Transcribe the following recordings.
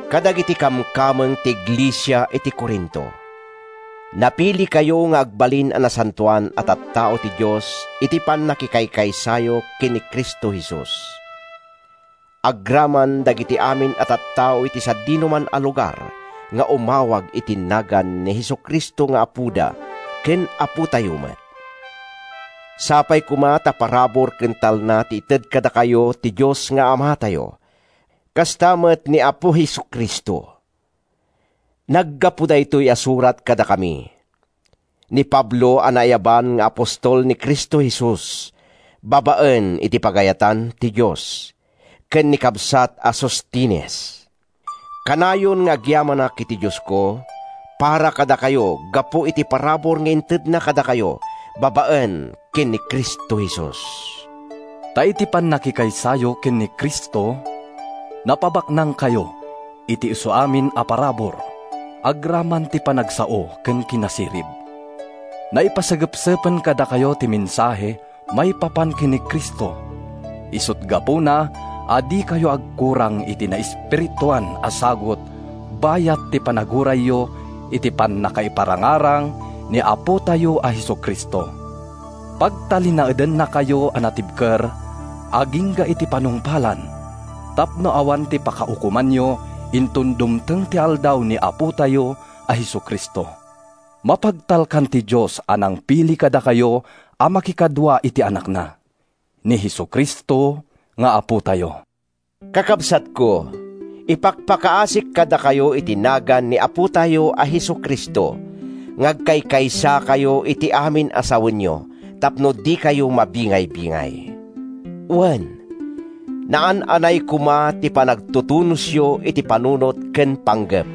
Kadagiti kamkameng ti iglesia iti Corinto: Napilikayo nga agbalin a nasantoan a tattao ti Dios iti pannakikaysayo ken ni Cristo Jesus, agraman dagiti amin a tattao iti sadinoman a lugar nga umawag iti nagan ni Jesu-Cristo nga Apoda ken Apotayo met. Sapay koma ta parabur ken talna ti ited kadakayo ti Dios nga Amatayo, kasta met ni Apo Jesu-Cristo. Naggapu daytoy a surat kadakami—ni Pablo a naayaban nga apostol ni Cristo Jesus babaen iti pagayatan ti Dios, ken ni kabsat a Sostenes. Kanayon nga agyamanak iti Diosko para kadakayo gapu iti parabur nga intedna kadakayo babaen ken ni Cristo Jesus. Ta iti pannakikaysayo ken ni Cristo, napabaknangkayo iti isuamin a parabur agraman ti panagsao ken kinasirib. Naipasagepsepen kadakayo ti mensahe maipapan ken ni Cristo, isut’ gapuna a dikayo agkurang iti naespirituan a sagut bayat ti panagurayyo iti pannakaiparangarang ni Apotayo a Jesu-Cristo. Pagtalinaedennakayo a natibker agingga iti panungpalan tapno awan ti pakaukomanyo inton dumteng ti Aldaw ni Apotayo a Jesu-Cristo. Mapagtalkan ti Dios a nangpili kadakayo a makikadua iti Anakna, ni Jesu-Cristo nga Apotayo. Kakabsatko, ipakpakaasik kadakayo iti nagan ni Apotayo a Jesu-Cristo nga agkaykaysakayo iti amin a sawenyo tapno dikayo mabingaybingay. Wen, naan-anay koma ti panagtutunosyo iti panunot ken panggep.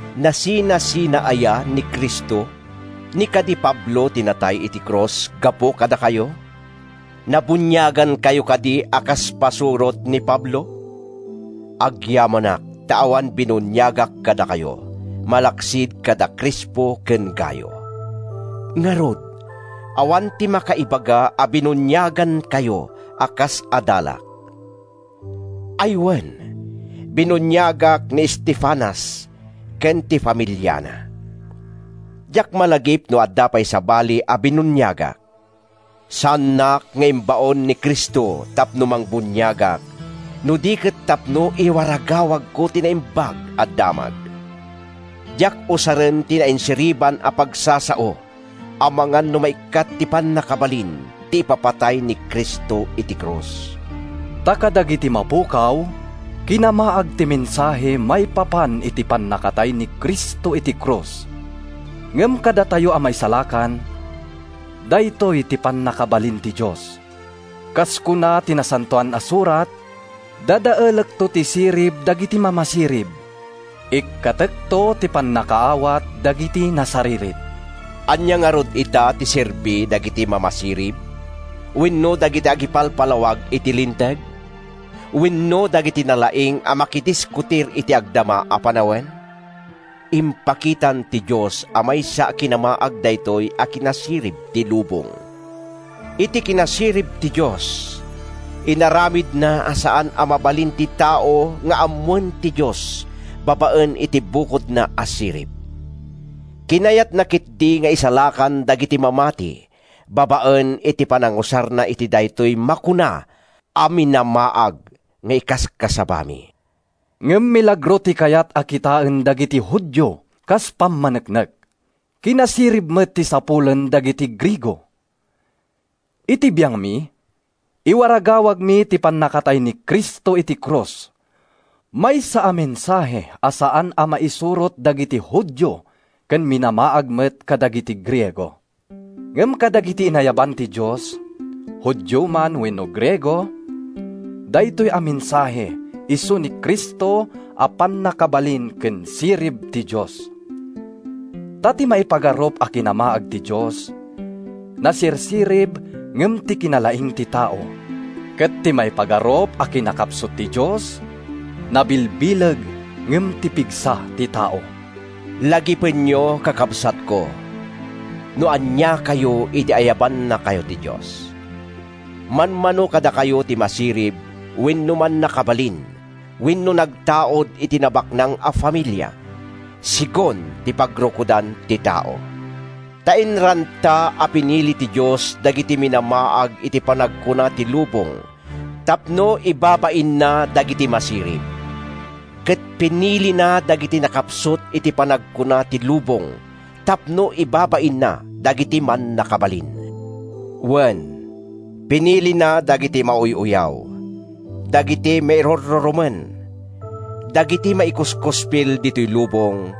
Nasinasina aya ni Cristo? Ni kadi Pablo ti natay iti krus gapu kadakayo? Nabuniagankayo kadi a kas pasurot ni Pablo? Agyamanak ta awan binuniagak kadakayo, malaksid kada Crispo ken Gayo. Ngarud, awan ti makaibaga a binuniagankayo a kas adalak. ( Ay, wen, binuniagak ni Estefanas ken ti familiana. Diak malagip no adda pay sabali a binuniagak.) Saannak nga imbaon ni Cristo tapno mangbuniagak, no di ket tapno iwaragawagko ti Naimbag a Damag. Diak usaren ti nainsiriban a pagsasao amangan no maikkat ti pannakabalin ti ipapatay ni Cristo iti krus. Ta kadagiti mapukaw, kinamaag ti mensahe maipapan iti pannakatay ni Cristo iti krus. Ngem kadatayo a maisalakan, daytoy ti pannakabalin ti Dios. Kas kuna ti Nasantoan a Surat, “Dadaelekto ti sirib dagiti mamasirib, ikkatekto ti pannakaawat dagiti nasaririt.” Ania ngarud ita ti serbi dagiti mamasirib? Wenno dagiti agipalpalawag iti Linteg? Wenno dagiti nalaing a makidiskutir iti agdama a panawen? Impakitan ti Dios a maysa a kinamaag daytoy a kinasirib ti lubong! Iti kinasirib ti Dios, inaramidna a saan a mabalin ti tao nga ammoen ti Dios babaen iti bukodna a sirib. Kinayatna ketdi nga isalakan dagiti mamati babaen iti panangusarna iti daytoy makuna a “minamaag” nga ikaskasabami. Ngem milagro ti kayat a kitaen dagiti Judio kas pammaneknek. Kinasirib met ti sapulen dagiti Griego. Iti biangmi, iwaragawagmi ti pannakatay ni Cristo iti krus, maysa a mensahe a saan a mairusok dagiti Judio ken minamaag met kadagiti Griego. Ngem kadagiti inayaban ti Dios, Judio man wenno Griego, daytoy a mensahe isu ni Cristo a pannakabalin ken sirib ti Dios. Ta ti maipagarup a kinamaag ti Dios, nasirsirib ngem ti kinalaing ti tao, ket ti maipagarup a kinakapsut ti Dios, nabilbileg ngem ti pigsa ti tao. Lagipenyo, kakabsatko, no aniakayo idi ayabannakayo ti Dios. Manmano kadakayo ti masirib wenno mannakabalin wenno nagtaud iti nabaknang a familia, segun ti pagrukodan ti tao. Ta inranta a pinili ti Dios dagiti minamaag iti panagkuna ti lubong tapno ibabainna dagiti masirib. Ket pinilina dagiti nakapsut iti panagkuna ti lubong tapno ibabainna dagiti mannakabalin. Wen, pinilina dagiti mauy-uyaw, dagiti mairurrurumen, dagiti maikuskuspil ditoy lubong,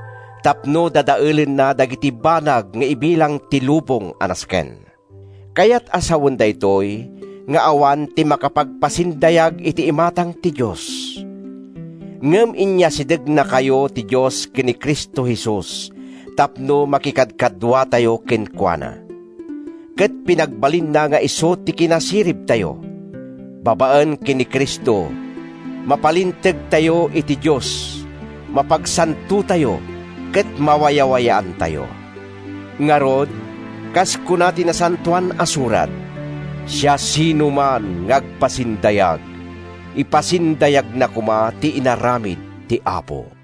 tapno dadaelenna dagiti banag nga ibilang ti lubong a nasken. Kayat a sawen daytoy nga awan ti makapagpasindayag iti imatang ti Dios. Ngem inyasidegnakayo ti Dios ken ni Cristo Jesus tapno makikadkaduatayo kenkuana, ket pinagbalinna nga isu ti kinasiribtayo. Babaen ken ni Cristo, mapalintegtayo iti Dios, mapagsantotayo ken mawayawayaantayo. Ngarud, kas kuna ti Nasantoan a Surat, “Siasinoman nga agpasindayag, ipasindayagna koma ti inaramid ti Apo.”